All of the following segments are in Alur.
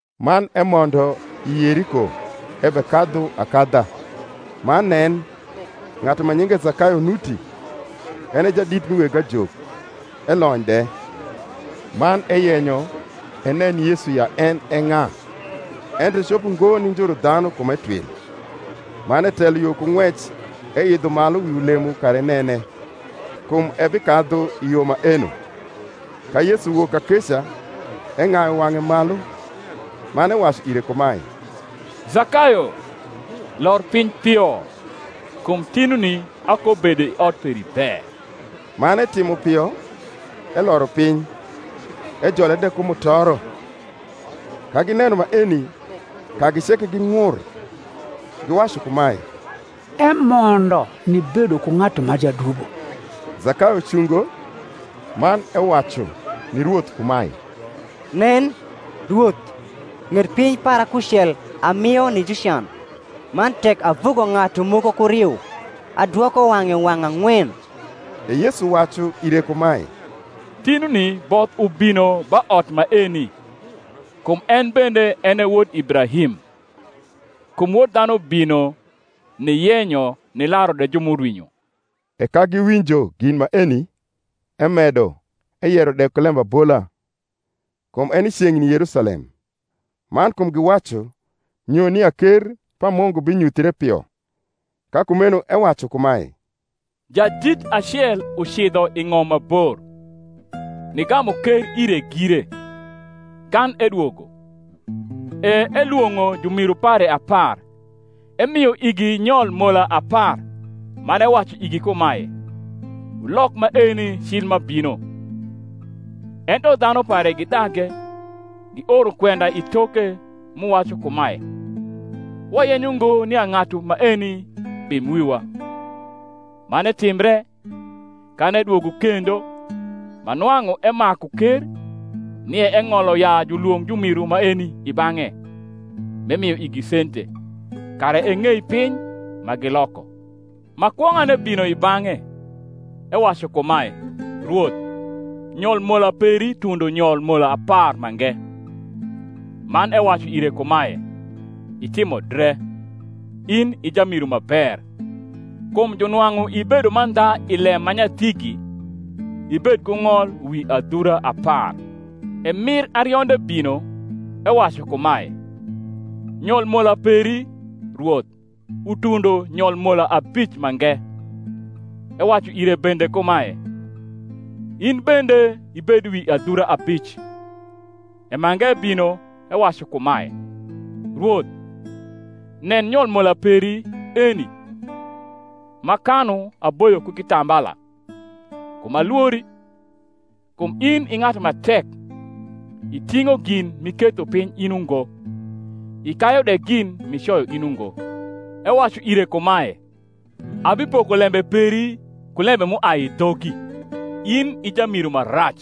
Man emondo i Yeriko ebekadhu akadha. Man nen, ng’atu ma nyinge Zakayo nuti; en e jadit mi weg ajok, elony de. Man eyenyo enen Yesu ya en e ng’a; ento ecopo ngo ni njuru dhanu, kum etwil. Man etelo yo ku ng’wec, eidho malu wi ulemo kara enene: kum ebikadhu i yo maeno. Ka Yesu wok kakeca, eng’ayu wang’e malu, man ewacu ire kumae, Zakayo, lor piny pio; kum tinuni akobedo i ot peri be. Man etimo pio, eloro piny, ejole de ku mutoro. Ka gineno maeni, kagi ceke ging’ur, giwacu kumae, Emondo nibedo ku ng’atu ma jadubo. Zakayo cungo, man ewacu ni Rwoth kumae, Nen, Rwoth, ng’et piny para kucel amio ni jucan; man tek avugo ng’atu moko ku riu, adwoko wang’e wang’ ang’wen. E Yesu wacu ire kumae, Tinuni both ubino ba ot maeni, kum en bende en e wod Ibrahim. Kum Wod dhanu bino niyenyo nilaru de ju m’urwinyo. E ka giwinjo gin maeni, emedo eyero de ku lembabola, kum eni ceng’ni Yerusalem, man kum giwacu nyo nia ker pa Mungu binyuthre pio. Ka kumeno ewacu kumae, Jadit acel ucidho i ng’om ma bor, nigamu ker ire gire, kan edwogo. E elwong’o jumiru pare apar, emio igi nyol mola apar, man ewacu igi kumae, Wulok maeni cil m’abino. Ento dhanu pare gidage, gioro kwenda i toke, m’uwacu kumae, Wayenyo ngo nia ng’atu maeni bim wiwa. Man etimbre, kan edwogo kendo, ma nwang’u emaku ker, nia eng’olo ya julwong’ jumiru maeni i bang’e, m’emio igi sente, kara eng’ei piny ma giloko. Ma kwong’ane bino i bang’e, ewacu kumae, Rwoth, nyol mola peri tundo nyol mola apar mange. Man ewacu ire kumae, Itimo dre, in i jamiru ma ber: kum junwang’u ibedo mandha i lem ma nyathigi, ibed ku ng’ol wi adhura apar. E mir arionde bino, ewacu kumae, nyol mola peri, Rwoth, utundo nyol mola abic mange. Ewacu ire bende kumae, In bende ibed wi adhura abic. E mange bino, ewacu kumae, Rwoth, nen, nyol mola peri eni, m’akanu aboyo ku kitambala: kum alwori, kum in i ng’atu ma tek: iting’o gin m’iketho piny in ungo, ikayu de gin m’icoyo in ungo. Ewacu ire kumae, Abipoko lembe peri ku lembe m’uai i dhogi, in i jamiru ma rac.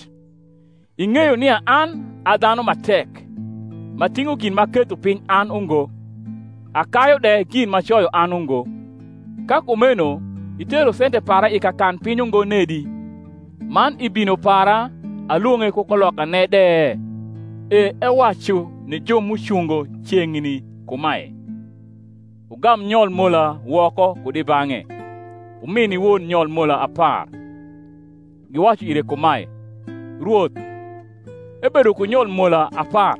Ing’eyo nia an a dhanu ma tek, m’ating’o gin m’aketho piny an ungo, akayu de gin m’acoyo an ungo; ka kumeno itero sente para i kakanpiny ungo nedi, man i bino para alwong’e ku kulokane de? E ewacu ni ju m’ucungo ceng’ni kumae, Wugam nyol mola woko kud i bang’e, wumi ni won nyol mola apar. Giwacu ire kumae, Rwoth, ebedo ku nyol mola apar.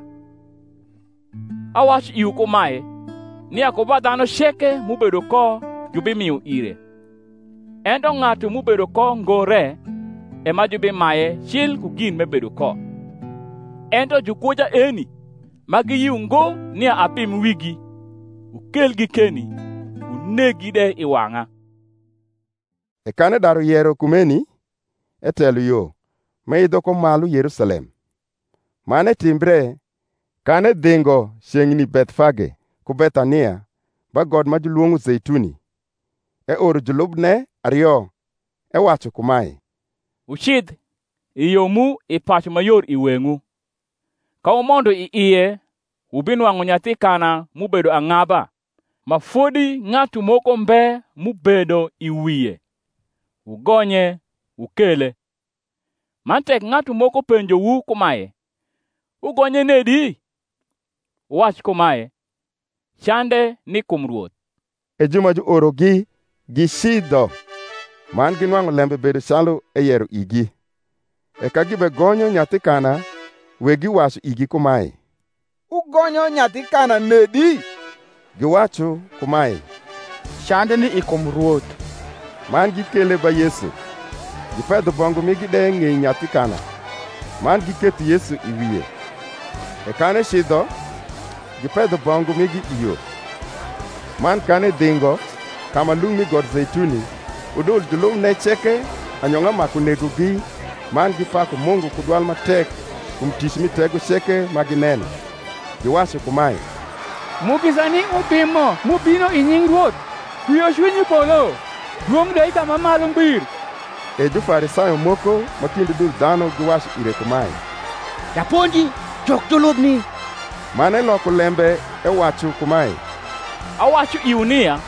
Awacu iwu kumae, nia ku ba dhanu ceke m’ubedo ko jubimio ire; ento ng’atu m’ubedo ko ngo re, e ma jubimaye cil ku gin m’ebedo ko. Ento jukwoja eni, ma giyio ngo nia abim wigi, wukelgi keni, wuneggi de i wang’a. E kan edaru yero kumeni, etelo yo, m’eidho ko mahi Yerusalem. Man etimbre, kan edhingo ceng’ni Bethfage ku Bethania, ba got ma julwong’o Zeituni, eoro julubne ario, ewacu kumae, Wucidh, i yo mu i pacu ma yor i weng’wu; ka wumondo i ie wubinwang’u nyathi kana m’ubedo ang’aba, ma fodi ng’atu moko mbe m’ubedo i wie: wugonye, wukele. Man tek ng’atu moko penjowu kumae, Wugonye nedi? wuwac kumae, Cande ni kum Rwoth. E ju ma juorogi gicidho, man ginwang’u lembe bedo calu eyero igi. E ka gibegonyo nyathi kana, wegi wacu igi kumae, Wugonyo nyathi kana nedi? Giwacu kumae, Cande ni i kum Rwoth. Man gikele ba Yesu: gipedho bongu migi de ng’ei nyathi kana, man giketho Yesu i wie. E kan ecidho, gipedho bongu migi i yo. Man kan edhingo, ka ma lung’ mi got Zeituni, udul julubne ceke anyong’a maku negogi man gipaku Mungu ku dwal ma tek kum tic mi tego ceke ma gineno; giwacu kumae, Mugisa ni Ubimo m’ubino i nying’ Rwoth: kwiocwiny i polo, dwong’ de i ka ma malu ngbir. E Jufarisayo moko ma kind udul dhanu giwacu ire kumae, Japonji, juk julubni. Man eloko lembe ewacu kumae, Awacu iwu nia,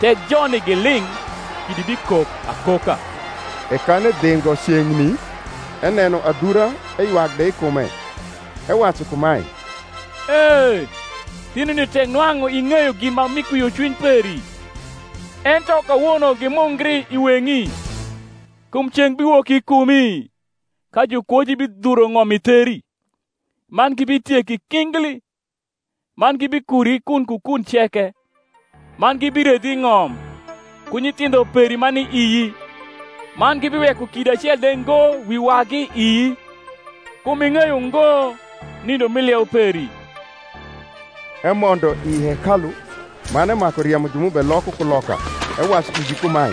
tek joni giling’ kidi bikok akoka. E kan edhingo ceng’ni, eneno adhura eywak de i kume, ewacu kumae, E, tinuni tek nwang’u ing’eyo gin ma mi kwiocwiny peri! ento kawono gimungri i weng’i. Kum ceng’ biwok i kumi, ka jukwoji bidhuro ng’om i theri, man gibitieki kingli, man gibikuri kun ku kun ceke, man gibiredhi i ng’om, ku nyithindho peri ma ni ii; man gibiweko kidi acel de ngo wi wagi ii; kum ing’eyo ngo nindo mi lieu peri. Emondo i hekalu, man emaku riemo ju m’ubeloko kuloka, ewacu igi kumae,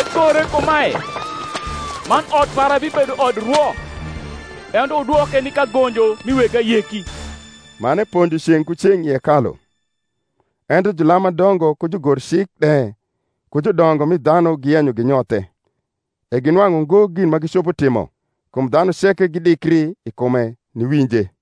Egore kumae, Man ot para bibedo odrwo: ento wudwoke ni kagonjo mi weg ayeki. Man eponjo ceng’ ku ceng’ i hekalu. Ento julam ma dongo ku jugorik de ku judongo mi dhanu giyenyo ginyothe: e ginwang’u ngo gin ma gicopo timo: kum dhanu ceke gidikri i kume, niwinje.